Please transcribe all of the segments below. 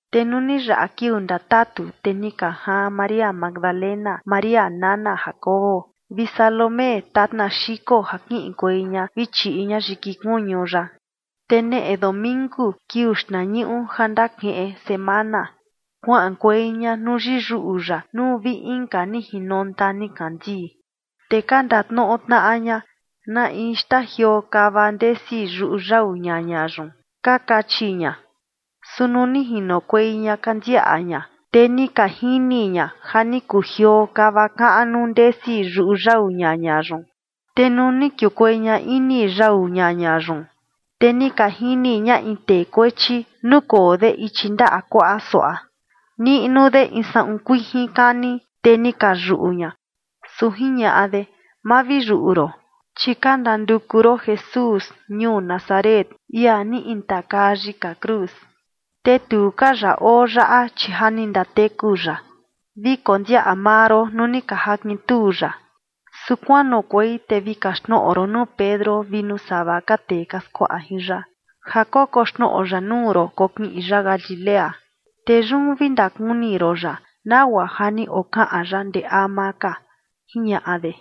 Te nuu ni yaꞌa kiuu ndatatu, te ni ka jaan María Magdalena, María nana Jacobo, vi Salomé tatna xiko ja kiꞌinkuei ña vi chiꞌi ña yiki kuñu ya. Te neꞌe domingu, kiuu xtnañuꞌu ja ndakiꞌin semana, kuaꞌankuei ña nuu yiyuꞌu ya nuu vi inka ni jinonta nikandii. Te ka ndatnoꞌo tnaꞌa ña: ―¿Na in xtajioo kava ndesi yuꞌu yau ñaña yun?, ka kachi ña. Su nuu ni jinokuei ña ka ndiaꞌa ña, te ni ka jini ña ja ni kujioo kava kaꞌnu ndesi yuꞌu yau ñaña yun. Te nuu ni kiukuei ña ini yau ñaña yun, te ni ka jini ña in tee kuechi, nukoo de ichi ndaꞌa kuaꞌa suaꞌa, niꞌnu de in saꞌun kuijin kani, te ni ka yuꞌu ña. Su jiñaꞌa de: ―Ma vi yuꞌu ron, chi ka ndanduku ron Jesús ñuu Nazaret, ia ni intakaa yika cruz. Te tu ka ya oo yaꞌa, chi ja ni ndateku ya. Vi kondiaꞌa maa ron nuu ni ka jakintuu ya. Su kuanoꞌokuei te vi kaxtnoꞌo ron nuu Pedro vi nuu sava ka tee ka skuaꞌa jin ya ja kokoxnoꞌo ya nuu ron kokiꞌin ya Galilea, te yun vi ndakuni ron ya, nagua ja ni okaꞌan ya ndee ama ka ―jiñaꞌa de.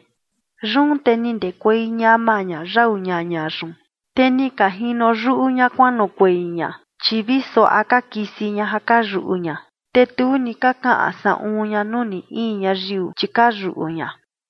Yun te ni ndekuei ñama ña yau ñaña yun, te ni ka jino yuꞌu ña kuanoꞌokuei ña, chi vi suaꞌa ka kisi ña ja ka yuꞌu ña. Te tu ni ka kaꞌan saꞌun ña nuu ni in ñayiu, chi ka yuꞌu ña.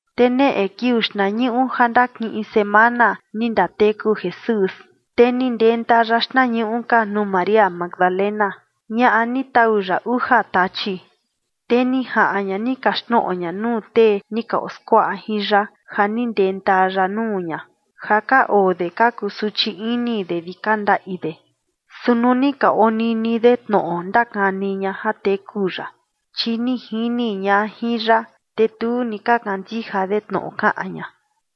[Te neꞌe kiuu xtnañuꞌu ja ndakiꞌin semana, ni ndateku Jesús, te ni ndenta ya xtnañuꞌu ka nuu María Magdalena, ñaꞌa ni tau ya uja tachi. Te ni jaꞌan ña ni kaxtnoꞌo ña nuu tee ni ka oskuaꞌa jin ya ja ni ndenta ya nuu ña, ja ka oo de ka kusuchi ini de vi ka ndaꞌi de. Su nuu ni ka onini de tnoꞌo ndakani ña ja teku ya, chi ni jini ña jin ya, te tu ni ka kandija de tnoꞌo kaꞌan ña.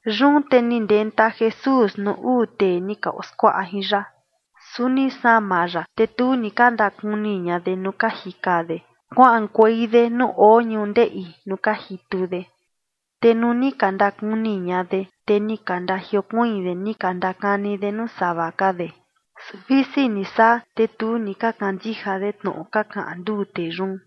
Yun te ni ndenta Jesús nuu uu tee ni ka oskuaꞌa jin ya, su ni sama ya, te tu ni ka ndakuni ña de nuu ka jika de kuaꞌankuei de nuu oo ñundeꞌi nuu ka jitu de. Te nuu ni ka ndakuni ña de, te ni ka ndajiokuiin de ni ka ndakani de nuu sava ka de. Su visi ni saa, te tu ni ka kandija de tnoꞌo ka kaꞌan nduu tee yun.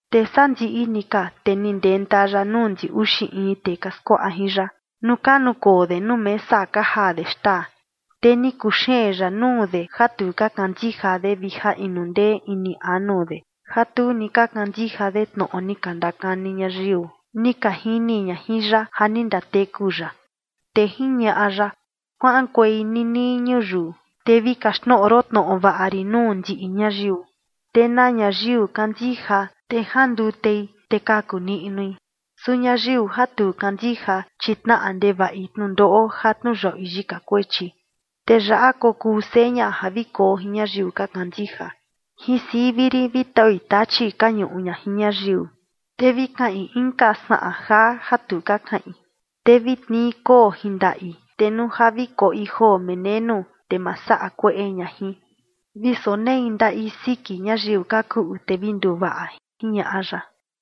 Te sandiꞌi ni ka, te ni ndenta ya nuu ndi uxi in tee ka skuaꞌa jin ya, nuu ka nukoo de nuu mesa ka jaa de xtaa. Te ni kuxeen ya nuu de ja tu ka kandija de vi ja inu ndee ini anu de, ja tu ni ka kandija de tnoꞌo ni ka ndakani ñayiu ni ka jini ña jin ya ja ni ndateku ya. Te jiñaꞌa ya: ―Kuaꞌankuei ninii ñuyiu, te vi kaxtnoꞌo ron tnoꞌo vaꞌa rin nuu ndiꞌi ñayiu. Te na ñayiu kandija, te jandutei, te kaku niꞌnui. Su ñayiu ja tu kandija, chi tnaꞌa ndevaꞌi tnundoꞌo ja tniuyaꞌui yika kuechi. Te yaꞌa kokuu seña ja vi koo jin ñayiu ka kandija: Jin sivi rin vi taui tachi ka ñuꞌu ña jin ñayiu, te vi kaꞌin inka saꞌan jaa ja tu ka kaꞌin. Te vi tnii koo jin ndaꞌi, te nuu ja vi koꞌi joo menenu, te ma saꞌa kueꞌe ña jin. Vi sonei ndaꞌi siki ñayiu ka kuꞌu, te vi nduvaꞌa ―jiñaꞌa ya.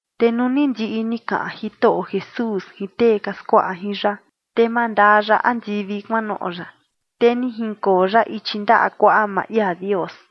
Te nuu ni ndiꞌi ni kaꞌan Jitoꞌo Jesús jin tee ka skuaꞌa jin ya, te mandaa ya andivi kuanoꞌo ya, te ni jinkoo ya ichi ndaꞌa kuaꞌa maa ia Dios.